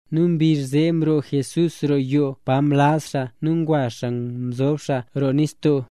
Nu mbizh zee mroo Jesús roo yoo pa mlaz xaa nu ngwa xaa mzob xaa roo nistoo.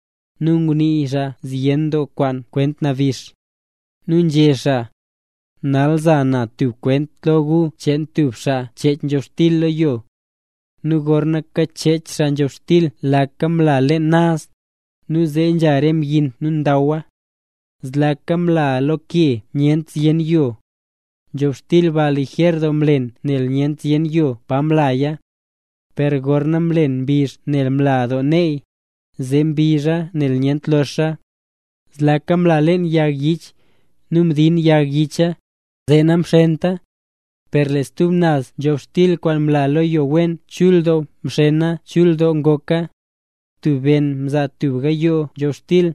Nu ngunii xaa zyen doo kwaan kwaan kwent nabix. Nu nzhé xaa: —Nal za na tub kwent lo gu cheen tub xaa nchech nzhobxtil lo yo. Nu gorna kachech xaa nzhobxtil laka mla leen naz, nu zee nzha re mbyin nu ndawa. Zlaka mla lo ke pa nyent zyen yo. Nzhobxtil ba lijer doo mlen nel nyent zyen yo pa mlaya. Per gorna mlen mbizh nel mla doo neey, zee mbizha nel nyent loxa. Zlaka mla leen yag yich, nu mdin yag yicha, zee namxenta. Per lee stub naz nzhobxtil kwaan mla lo yo wen chul doo mxena nu chul doo ngoka. Tub ben mzaa tub gayoo nzhobxtil,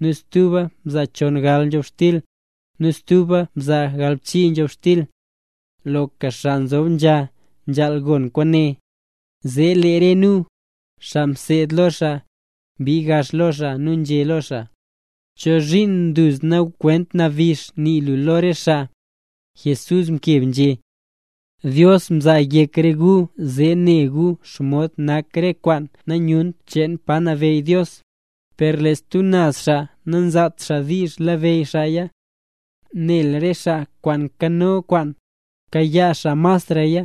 nu stuba mzaa chongal nzhobxtil, nu stuba mzaa galbchii nzhobxtil. ¡Loka xaa nzob nzha, nzhaal gon kwaane! Zee lee re nu, xaa mseed lo xaa, mbii gax lo xaa nu nzhé nu lo xaa: —¿Chozhiin duzna kwent nabix nii lu lo re xaa? Jesús mkeb nzhé: —Dios mzaa yek re gu zee ne gu xomod nak re kwaan nanyunt cheen pa nabeyy Dios; per lo stub naz xaa namzaat xaa diizh labeyy xaaya. Nel lee re xaa kwaan nkano kwaan, kayaa xaa masraya;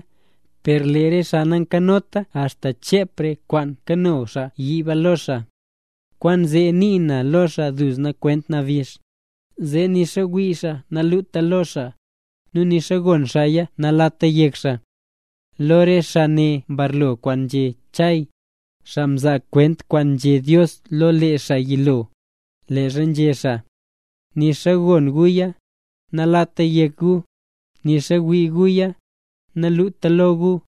per lee re xaa nankanota axta chep re kwaan nkano xaa yiib lo xaa. Kwaanzee nii na lo re xaa duzna kwent nabix, zee nixa wii xaa naluta lo xaa, nu nixa gon xaaya nalata yek xaa. Lo re xaa ne mbarlo kwaan nzhé Chay, xaa mzaa kwent kwaan nzhé Dios lo lee xaa yilo, leezha nzhé xaa: Nixa gon guya, nalata yek gu, nixa wii guya, naluta lo gu.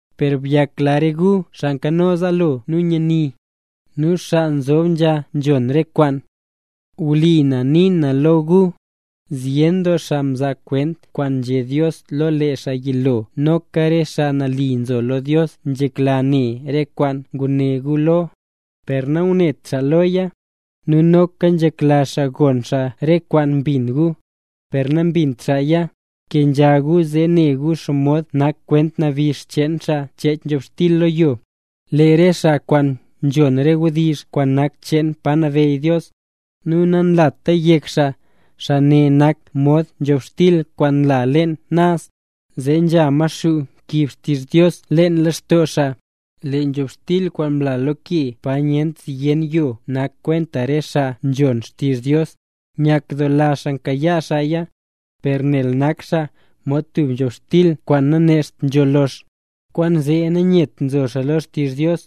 ’Per byakla re gu, xaa nkano zaalo nu nyani, nu xaa nzob nzha nzhon re kwaan. Wlipa na nii na lo gu, zyen doo xaa mzaa kwent kwaan nzhé Dios lo lee xaa yilo nu noka re xaa nali mzo lo Dios, nzhekla ne re kwaan ngune gu lo, per nangunet xaa loya; nu noka nzhekla xaa gon xaa re kwaan mbin gu, per nambint xaaya. ’Kenzha gu zee ne gu xomod nak kwent nabix cheen xaa nchech nzhobxtil lo yo. Lee re xaa kwaan nzhon re wdizh kwaan nak cheen pa nabeyy Dios, nu nanlata yek xaa, xaa ne nak mod nzhobxtil kwaan mla leen naz, zee nzha Maxuu nkiib xtizh Dios leen lextoo xaa. Lee nzhobxtil kwaan mla lo ke pa nyent zyen yo nak kwenta re xaa nzhon xtizh Dios, nyakdoola xaa mkayaa xaaya. Per nel nak xaa mod tub nzhobxtil kwaan nanecht nzho lox, kwaanzee nanyet nzo xaa lo xtizh Dios.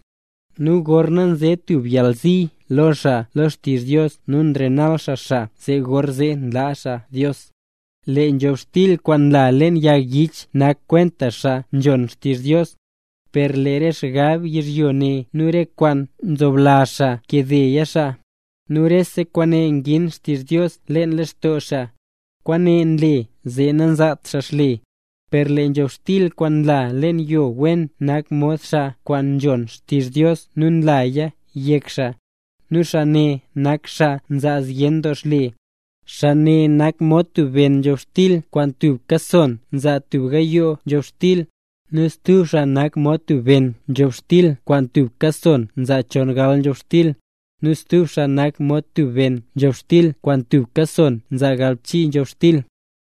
Nu gorna nze tub yalzi lo xaa lo xtizh Dios nu nrenal xaa xaa, gorzee nlaa xaa Dios. Lee nzhobxtil kwaan mla leen yag yich nak kwenta xaa nzhon xtizh Dios, per lee re xgab yizhyo ne nu re kwaan nzoblazh xaa nkade xaa. Nu rese kwaane ngin xtizh Dios leen lextoo xaa. Kwaane nle zee nanzaat xaa xle. Per lee nzhobxtil kwaan mla leen yo wen nak mod xaa kwaan nzhon xtizh Dios nu nlaya yek xaa. Nu xaa ne nak xaa nzaa zyen doo xle. Xaa ne nak mod tub ben nzhobxtil kwaan tubka son nzaa tub gayoo nzhobxtil, nu stub xaa nak mod tub ben nzhobxtil kwaan tubka son nzaa chongal nzhobxtil, nu stub xaa nak mod tub ben nzhobxtil kwaan tubka son nzaa galbchii nzhobxtil.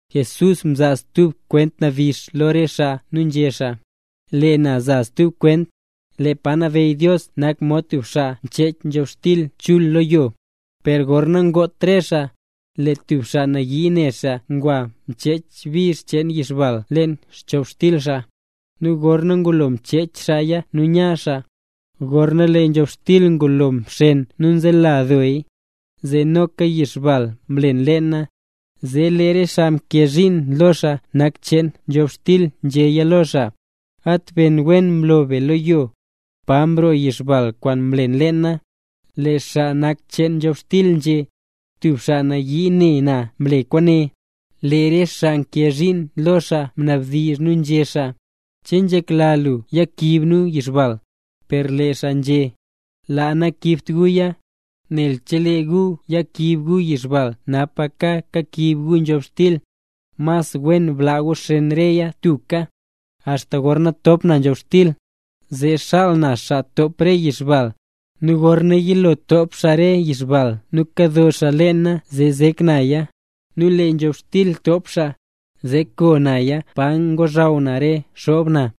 Jesús mzaa stub kwent nabix lo re xaa nu nzhé xaa: —Lee na za stub kwent. Lee pa nabeyy Dios nak mod tub xaa nchech nzhobxtil chul lo yo. Per gorna ngot re xaa, lee tub xaa nayii ne xaa ngwa mchech bizh cheen yixbal leen nzhobxtil cheen xaa. Nu gorna ngulo mchech xaaya nu nya xaa. Gorna lee nzhobxtil ngulo mxen nu nzela dooy, zee noka yixbal mlen leena. Zee lee re xaa nkee zhiin lo xaa nak cheen nzhobxtil nzhéya lo xaa: “¡At ben wen mloo be lo yo! ¿Pa mroo yixbal kwaan mlen leena?” Lee xaa nak cheen nzhobxtil nzhé: “Tub xaa nayii ne na mle kwaane”. Lee re xaa nkee zhiin lo xaa mnabdizh nu nzhé xaa: “¿Che nzhekla lu yakiib nu yixbal?” Per lee xaa nzhé: “Laa, nayakiibt guya. Nel chelee gu yakiib gu yixbal napaka kakiib gu nzhobxtil. Mas wen blaa gu xen reya tubka, axta gorna top na nzhobxtil. Zee xaal na xaa top re yixbal, nu gorna yilo top xaa re yixbal nu kado xaa leena zee zek naya, nu lee nzhobxtil top xaa, zee koo naya pa ngozhaw na re xoob na.”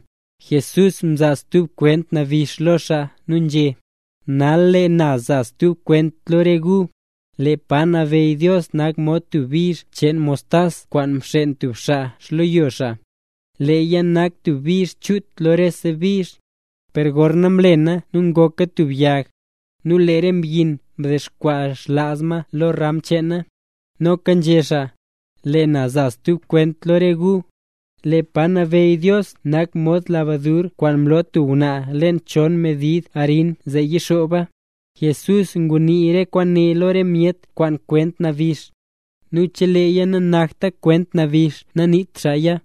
Jesús mzaa stub kwent nabix lo xaa nu nzhé: —Nal lee na za stub kwent lo re gu. Lee pa nabeyy Dios nak mod tub bizh cheen mostas kwaan mxen tub xaa xleyo xaa. Leeya nak tub bizh chut lo rese bizh, per gorna mlena nu ngoka tub yag, nu lee re mbyin mdexkwaa xlaaz ma lo re ram cheena. Noka nzhé xaa: —Lee na za stub kwent lo re gu. Lee pa nabeyy Dios nak mod lebadur kwaan mlo tub ngwnaa leen chon medid arin zee yixooba. Jesús ngunii re kwaane lo re myet kwaan kwent nabix, nu cheleeya nanakta kwent nabix naniit xaaya.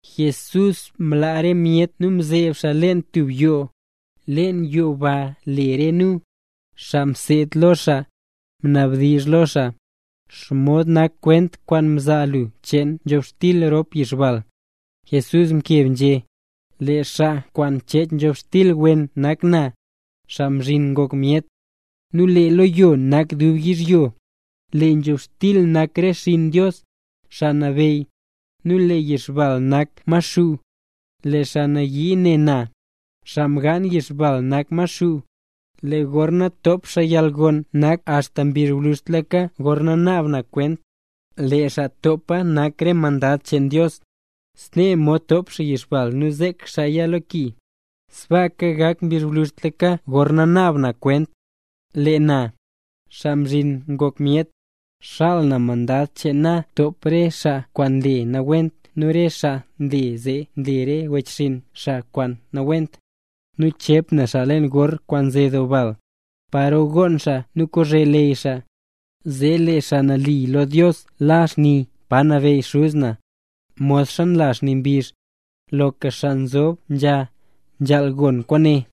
Jesús mlaa re myet nu mzeeb xaa leen tub yoo. Leen yoo ba lee re nu, xaa mseed lo xaa, mnabdizh lo xaa: —¿Xomod nak kwent kwaan mzaa lu cheen nzhobxtil rop yixbal? Jesús mkeb nzhé: —Lee xaa kwaan mchech nzhobxtil wen nak na, Xaa Mzhin Ngok Myet. Nu lee leyo nak dub yizhyo, lee nzhobxtil nak re xinn Dios, Xaa Nabeyy, nu lee yixbal nak xaa Maxuu. Lee xaa nayii ne na, xaa mgaan yixbal nak Maxuu. Lee gorna top xaa yalgon nak axta mbizh gwluzhtlaka gorna naab na kwent, lee xaa topa nak re mandad cheen Dios. Snee mod ntop xaa yixbal nu nzek xaaya lo ki, sbaaka gak mbizh gwluzhtlaka gorna naab na kwent. Lee na, Xaa Mzhin Ngok Myet, xaal na mandad cheen na top xaa re xaa kwaan nle nawent, nu re xaa nle zee nle re wechxinn xaa kwaan nawent. Nu chep na xaa leen gor kwaan nze doo bal, paro gonn xaa nu kozhe leyy xaa. Zee lee xaa nali nak lo Dios la xni pa nabeyy Xuz na, modxa nla xni mbizh. ¡Loka xaa nzob nzha, nzhaal gon kwaane!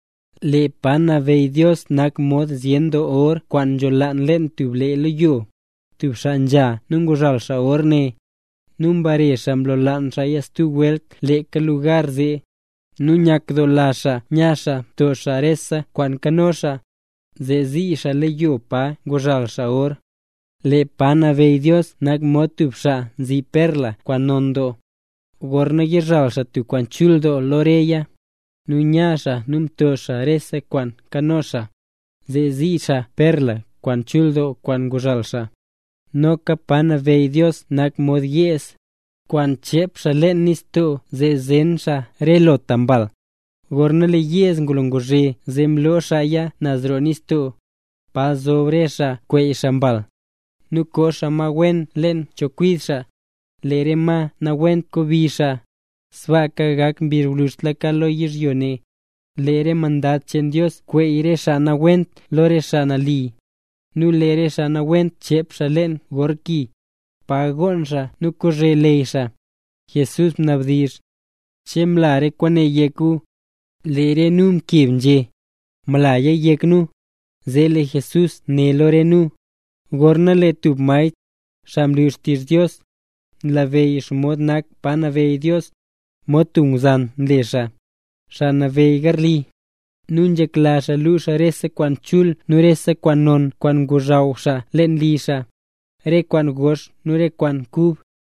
’Lee pa nabeyy Dios nak mod zyen doo or kwaan nzholaan leen tub lee leyo. Tub xaa nzha nu nguzhal or ne, nu mbare xaa mlolaan xaaya stub welt leeka lugar zee. Nu nyakdoola xaa nya xaa mto xaa rese kwaan nkano xaa, zee zii xaa leyo pa nguzhal xaa or. ’Lee pa nabeyy Dios nak mod tub xaa nzi perla kwaan non doo. Gorna yizhal xaa tub kwaan chul doo lo reya, nu nya xaa nu mto xaa rese kwaan nkano xaa, zee zii xaa perla kwaan chul doo kwaan nguzhal xaa. ’Noka pa nabeyy Dios nak mod yeez, kwaan nchep xaa leen nistoo zee zen xaa re lota mbal. Gorna lee yeez ngulo nguzhe zee mloo xaaya naz roo nistoo, pa zob re xaa kweey xaa mbal. Nu koo xaa ma wen leen xchekwid xaa, lee re ma nawent ngobi xaa. Sbaaka gak mbizh gwluzhtlaka lo yizhyo ne. Lee re mandad cheen Dios kweey re xaa nawent lo re xaa nali. Nu lee re xaa nawent chep xaa leen gor ki, pa gonn xaa nu kozhe leyy xaa. Jesús mnabdizh: —¿Che mla re kwaane yek re gu? Lee re nu mkeb nzhé: —Mlaya yek nu. Zee lee Jesús né lo re nu: —Gorna lee tub maestr, xaa nlu xtizh Dios, nlabeyy xomod nak pa nabeyy Dios, mod tub ngwzan nle xaa, xaa nabeyy garli. Nu nzhekla xaa luu xaa rese kwaan chul nu rese kwaan non kwaan ngozhaw xaa leen li xaa, re kwaan gox nu re kwaan kub.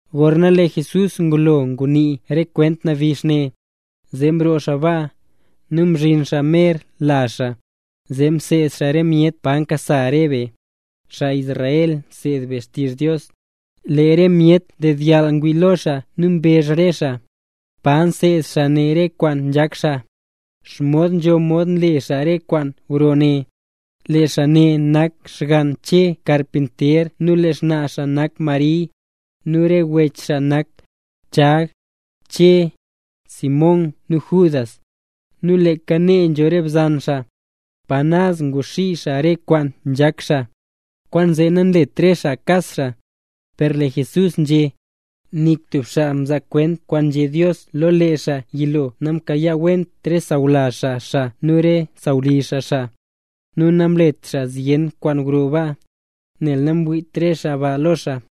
Gorna lee Jesús ngulo ngunii re kwent nabix ne, zee mroo xaa baa, nu mzhin xaa mer lazh xaa. Zee mseed xaa re myet pa nkasa re be, xaa Israel nseed be xtizh Dios. Lee re myet ndedyall ngwii lo xaa nu mbezh re xaa: —¿Pa mseed xaa ne re kwaan nzhak xaa? ¿Xomod nzho mod nle xaa re kwaan gro ne? ¡Lee xaa ne nak xgann Che karpinter nu lee xnaa xaa nak Mari, nu re wech xaa nak Chag, Che, Simón nu Judas! Nu leeka nee nzho re bzan xaa. ¿Pa naz nguxii xaa re kwaan nzhak xaa? Kwaanzee nanlet re xaa kas xaa. Per lee Jesús nzhé: —Nik tub xaa mzaa kwent kwaan nzhé Dios lo lee xaa yilo namkayaawent re sawlazh xaa xaa nu re sawlizh xaa xaa. Nu namlet xaa zyen kwaan gro baa, nel namwiit re xaa ba lo xaa.